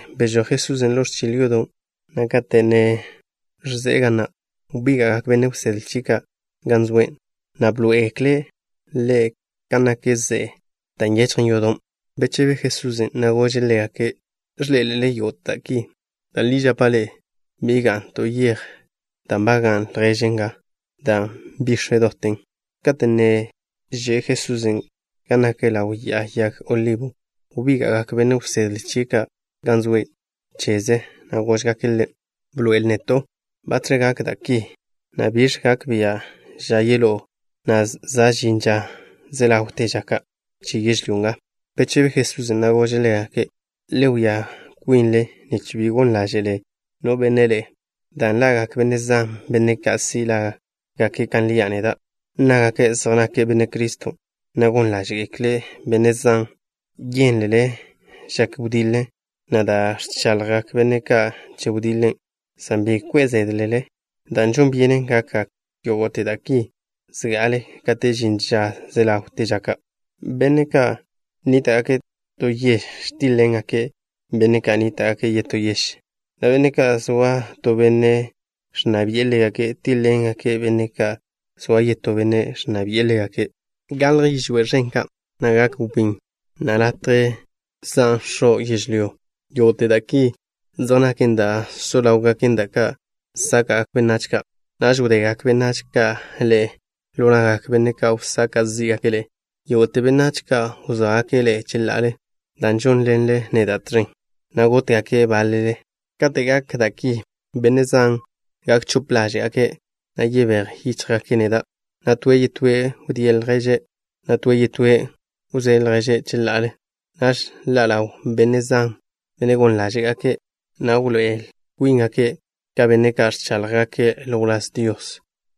Bžoj Jesusen' ḻo ẕchil yodo', na' kate' ne ẕze'e ga na' wbíga'gak benne' wsedle chie' ka' gan zoe', na' bḻoé'egekle' Ḻe' kan nak ze'e na', da' nyechjen yodon'. Bechebe Jesusen', na' gože' ḻégake': —¿Ẕḻé'elele yógo'te da' ki? Da' li žapa' ḻe'e, bi ga'n to yej da' nbagan' lježen nga, dan' bix̱ doten. Kate' ne že' Jesusen' gan nak ḻaw Ya'a Yag Olibo, wbíga'gak benne' wsedle chie' ka' gan zoe' cheze', na' góžgake' Ḻe': —Bḻoe'el neto', ¿Batx̱ gakgak da' ki, na' biẕ gak bia' ža yeḻó'o, na' za' žin ža ze ḻawte ža ka' che yežlyó nga? Bechebe Jesusen', na' gože' ḻégake': —Le wia kwinle nich bi gon ḻáže'le no benne' ḻe'e, dan' ḻa'gak benne' zan, benne' ka' si' lágake' kan lia' neda'. Nnágake' zej nake' Benne' Criston', na' gon ḻáže'gekle' benne' zan. Yénlele žak wediḻe, na' da' ẕchaḻjgak benne' ka' che wediḻe, san bi kwe' zédlele, dan' žon byenen gakgak yógo'te da' ki zga'ale kate' žin ža ze ḻawte ža ka'. Benne' ka' nníta'gake' to yež tíḻ-ḻengake' benne' ka' nníta'gake' yetó yež, na' benne' ka' zoa to benne' ẕnna bi'e ḻégake' tíḻ-ḻengake' benne' ka' zoa yetó benne' ẕnna bi'e ḻégake'. Galj yižwé' ẕen ka', na' gak wbín, na' latje zan x̱o' yežlyó. Yógo'te da' ki zej naken da' so ḻáwgaken, da' ka' sáka'gak benách ka'. ’Naž wdegak benách ka' ḻe'e ḻo na'gak benne' ka' wsaka' zí'gake' ḻe'e. Yógo'te benách ka' wzóagake' ḻe'e cheḻa'ale, dan' žónḻenle neda' tẕen, na' gótgake' báḻele ḻe'e. Kate' gak da' ki, benne' zan gak chope ḻáže'gake', na' yebéj yíchjgake' neda', na' toe' yetóe' wdíe' lježe', na' toe' yetóe' wzóe' lježe' cheḻa'ale. Naž ḻa' ḻawgak benne' zan, benne' gon ḻáže'gake', na' wḻoé'el kwíngake' ka benne' ka' ẕcháḻjgake' ḻo wláz Dios,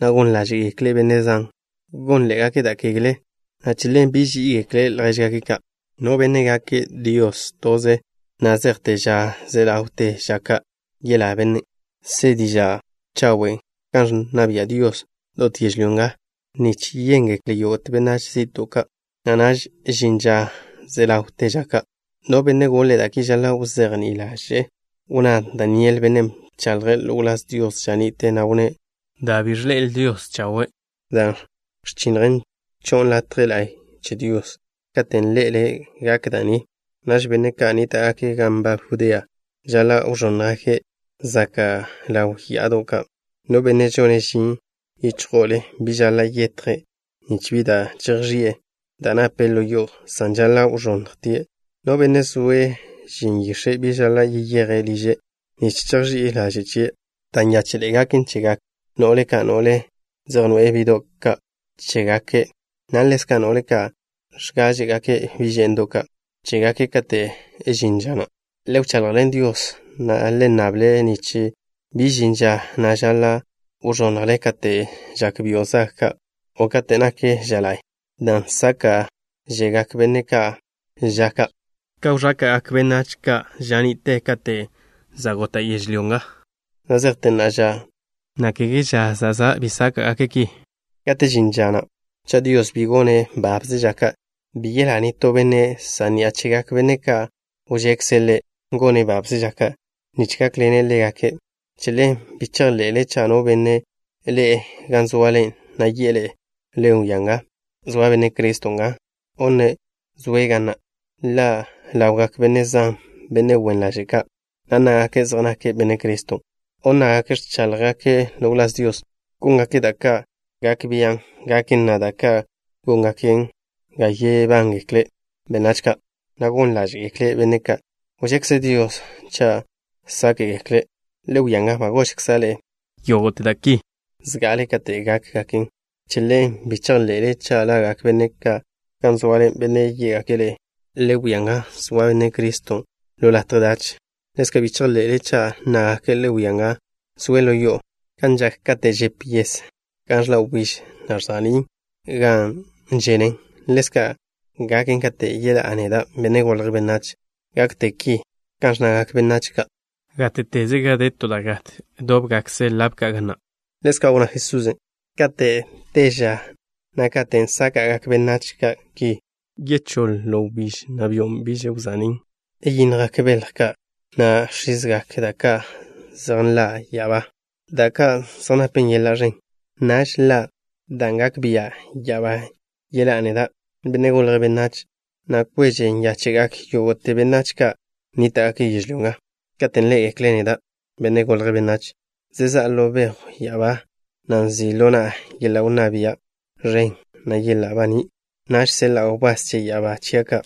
na' gon ḻáže'gekle' benne' zan. Gónḻe'egake' da' kegle, na' che ḻen biž ží'igekle' ljéžgake' ka'. No benne' gake' Dios toze na' zejte ža ze ḻawte ža ka', yelá bennen'. Se diža' chawen' kan ẕnna bia' Dios dot yežlyó nga nich yéngekle yógo'te benách zi'to' ka', na' naž žin ža ze ḻawte ža ka'. ’No benne' goḻe' da' ki žaḻa' wzejní'i ḻaže'e. Wnná Daniel, bennen' bchaḻje' ḻo wláz Dios ža ni'te, na' wnné': “Da' bi ẕḻe'el Dios chawe', dan' ẕchinnjen, cho'on latje la'y che Dios.” Kate' ḻé'elele gak da' ni, naž benne' ka' nníta'gake' gan nbab Judea žaḻa' wẕónnjgake' zaka' ḻaw ya'ado' ka'. No benne' žone' žin yíchjo'ole bi žaḻa' yetje' nich bi da' chejx̱i'e da' nape' ḻo yo'o, san žaḻa' wẕonnjtie'. No benne' zoe' žin yix̱e', bi žaḻa' yeyeje' liže' nich chejx̱i'e laže' chie'. Da' nyáche'ḻe'e gaken chegak no'le ka', no'le zej noe'e bi'do' ka' chégake', na' ḻezka' no'le ka' ẕgáẕe'gake' bi' že'ndo' ka' chégake' kate' žin ža na'. Le wchaḻjḻen Dios, na' le nnable' nich bi žin ža na' žaḻa' wẕonnjle kate' žak byo' zag o kate' nak ža la'y, dan' sáka'žegak benne' ka' ža ka', ka wẕáka'gak benách ka' ža ni'te kate' za' gota' yežlyó nga, na' zejte na'a ža, na' kege ža zezá' bi sáka'gake' ki. Kate' žin ža na', cha' Dios bi gone' babze ža ka', bi yelá nitó benne', san ni'a chegak benne' ka' wžekze' Ḻe' gone' babze ža ka', nich gákḻene' ḻégake'. ’Che ḻen bi chejḻe'le cha' no benne' ḻe'e gan zoale, na' yi'e ḻe'e: “Le wia nga, zoa Benne' Criston' nga”, o nne': “Zoe' ga na'.” Ḻa' ḻawgak benne' zan, benne' wen ḻaže' ka', na' nnágake' zej nake' Benne' Criston', o nnágake' ẕcháḻjgake' ḻo wláz Dios. Góngake' da' ka' gak biá'gaken, na' da' ka' góngaken ga yebángekle benách ka', na' gon ḻáže'gekle' benne' ka' wžekze Dios cha' sáke'gekle'. Le wia nga, ba gožkza' ḻe'e yógo'te da' ki zga'ale kate' gákgaken. Che ḻen, bi chejḻe'le cha' ḻa'gak benne' ka' gan zoale, benne' yé'gake' ḻe'e: “Le wia nga, zoa Benne' Criston' ḻo latje dach.” Ḻezka', bi chejḻe'le cha' nnágake': “Le wia nga, zoe' ḻo yo'o.” Kan žak kate' žep yes gan ẕḻa' wbíž, na' ẕza'ní' gan ženen, ḻezka' gaken kate' yeḻá'a neda', Benne' Golje' Benách. Gakte ki, kan ẕnnagak benách ka': “Gáte'teze gan de to da' nat, dóbgakkze lab ka' ga na'.” Ḻezka' wnná Jesusen': —Kate' te ža na' katen' sáka'gak benách ka' ki, wchóḻ wbíž, na' byo' bi gonnen baní' chen. Yindjgak belj ka', na' ẕizgak da' ka' zej nḻa' ya'abá, da' ka' zej napen yeḻa' ẕen. Naž ḻa' dan' gak bia' ya'abá yeḻá'a neda', Benne' Golje' Benách, na' kweže nyáche'gak yógo'te benách ka' nníta'gake' yežlyó nga, katen' ḻé'egekle' neda', Benne' Golje' Benách, zezá'a ḻo bejw ya'abá, na' nzi' ḻo na'a yeḻa' wnná bia' ẕen, na' yeḻa' baní'. Naž seḻa'a wbás che ya'abá chia' ka'.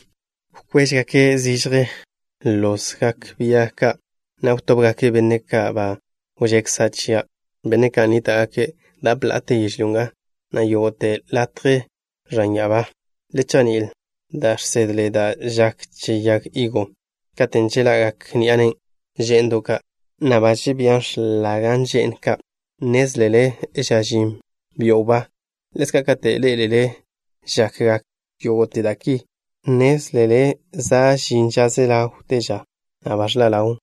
Wkwéžegake' zižje lozgak bia ka', na' wtóbgake' benne' ka' ba wžekza' chia', benne' ka' nníta'gake' dap la'ate yežlyó nga, na' yógo'te latje ẕan ya'abá. ’Le chejní'il da' žsedle da' žak che yag higo. Katen' žeḻa'gak ni'a nen' že'ndo' ka', na' ba žebía x̱lagen že'n ka', nnézlele za' žin byo' wbá. Ḻezka', kate' ḻé'elele žakgak yógo'te da' ki, nnézlele za' žin ža ze ḻawte ža, na' ba ẕḻa' ḻawn.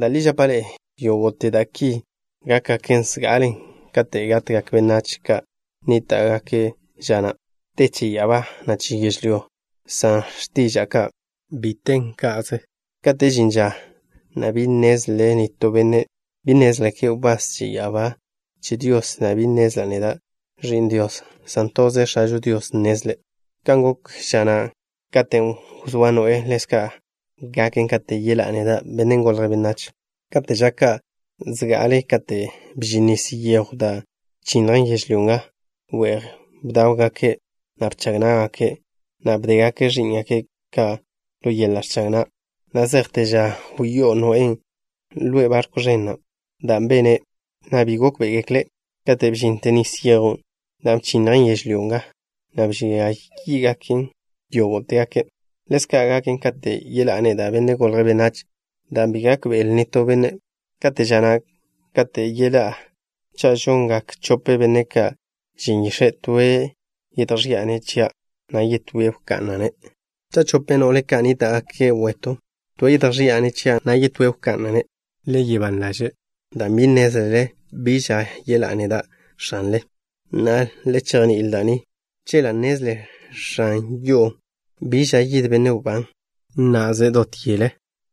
Da' li žapa' ḻe'e, yógo'te da' ki gákgaken zga'ale kate' gatgak benách ka' nníta'gake' ža na'. Te che ya'abá, na' che yežlyó nga, san x̱tiža'a ka' bi tégaken ka'ze. ’Kate' žin ža na' bi nnezle nitó benne'. Bi nnézgekle wbás che ya'abá ka' che Dios, na' bi nnezla' neda', Ẕi'n Dios, san toze X̱ažo Dios nnezlen'. ’Kan gok ža na' katen' wzóa Noé, ḻezka' gaken kate' yeḻá'a neda', Benne' Golje' Benách. Kate' ža ka' zga'ale kate' bžin nis yejw da' bchinnjen yežlyó nga, we'j bdáwgake', na' bchag ná'gake', na' bdégake' ẕí'ngake' ka' ḻo yeḻa' ẕchag na' na' zejte ža wyó'o Noén' ḻe'e barkw ẕen na', dan' bene', na' bi gókbe'egekle' kate' bžinte nis yejw dan' bchinnjen yežlyó nga, na' bžia yí'gake' yógo'tegake'. Ḻezka' gaken katen' yeḻá'a neda', Benne' Golje' Benách, dan' bi gákbe'le nitó benne'. Kate' ža na' kate' yeḻá'a, cha' žongak chope benne' ka' žin yix̱e', toe' yedjži'a-ne' chia', na' yetóen' wka'na'-ne'. Cha' chope no'le ka' nníta'gake' wetw, toe' yedjži'a-ne' chia', na' yetóen' wka'na'-ne'. ’Le soa ban ḻaže' dan' bi nnézlele biẕ ža yeḻá'a neda', X̱anle. Na'a, le chejní'il da' ni. Chela' nnezle x̱an yo'o bi ža yid benne' wbán, na' nná'zele' dot yele,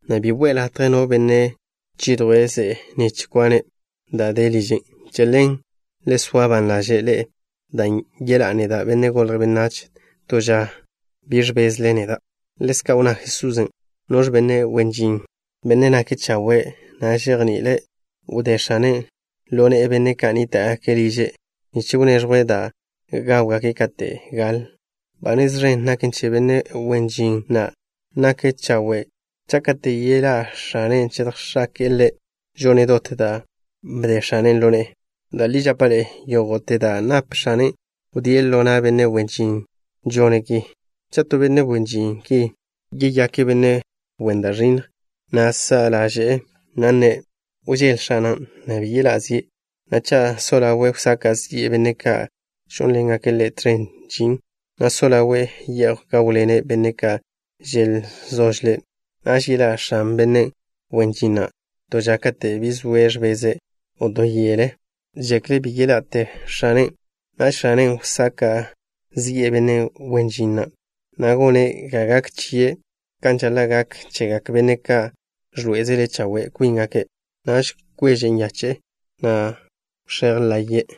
na' bi we'e latje no benne' chidjwe' ze'e nich kwane' da' de liže'. Che ḻen, le soa ban ḻaže' ḻe'e, dan' yeḻá'a neda', Benne' Golje' Benách, to ža bi ẕbezle neda'. Ḻezka' wnná Jesusen': —¿Noẕ benne' wen žin, benne' nake' chawe', na' žejni'ile', wdé x̱ane' ḻo ne'e benne' ka' nníta'gake' liže' nich wneẕjwe' da' gáwgake' kate' gale'? Ba nez ẕen gaken che benne' wen žin na' nake' chawe', cha' kate' yeḻé'e x̱ane', yedjx̱ake'e ḻe' žone' dot da' bde x̱ane' ḻo ne'e. Da' li žapa' ḻe'e, yógo'te da' nap x̱ane', wdíe' ḻo na' benne' wen žin žone' ki. Cha' to benne' wen žin ki yeyake' benne' wen da' ẕinnj, na' sa' ḻaže'e, na' nne': “Wžél x̱ana', na' bi yeḻá' zie'”, na' cha' so ḻawe' wsaka' zi'e benne' ka' žónḻengake' ḻe' tẕen žin, na' so ḻawe' ye'j gáwḻene' benne' ka' želzožle', naž yeḻá' x̱an benne' wen žin na' to ža kate' bi zoe' ẕbeze', o to yele žekle' bi ḻa'te x̱anen'. Naž x̱anen' wsaka' zi'e benne' wen žin na', na' gone' ga gak chie' kan žaḻa' gak chegak benne' ka' ẕḻoé'ezele chawe' kwíngake'. Naž kweže nyache'e, na' wx̱éj laye'e.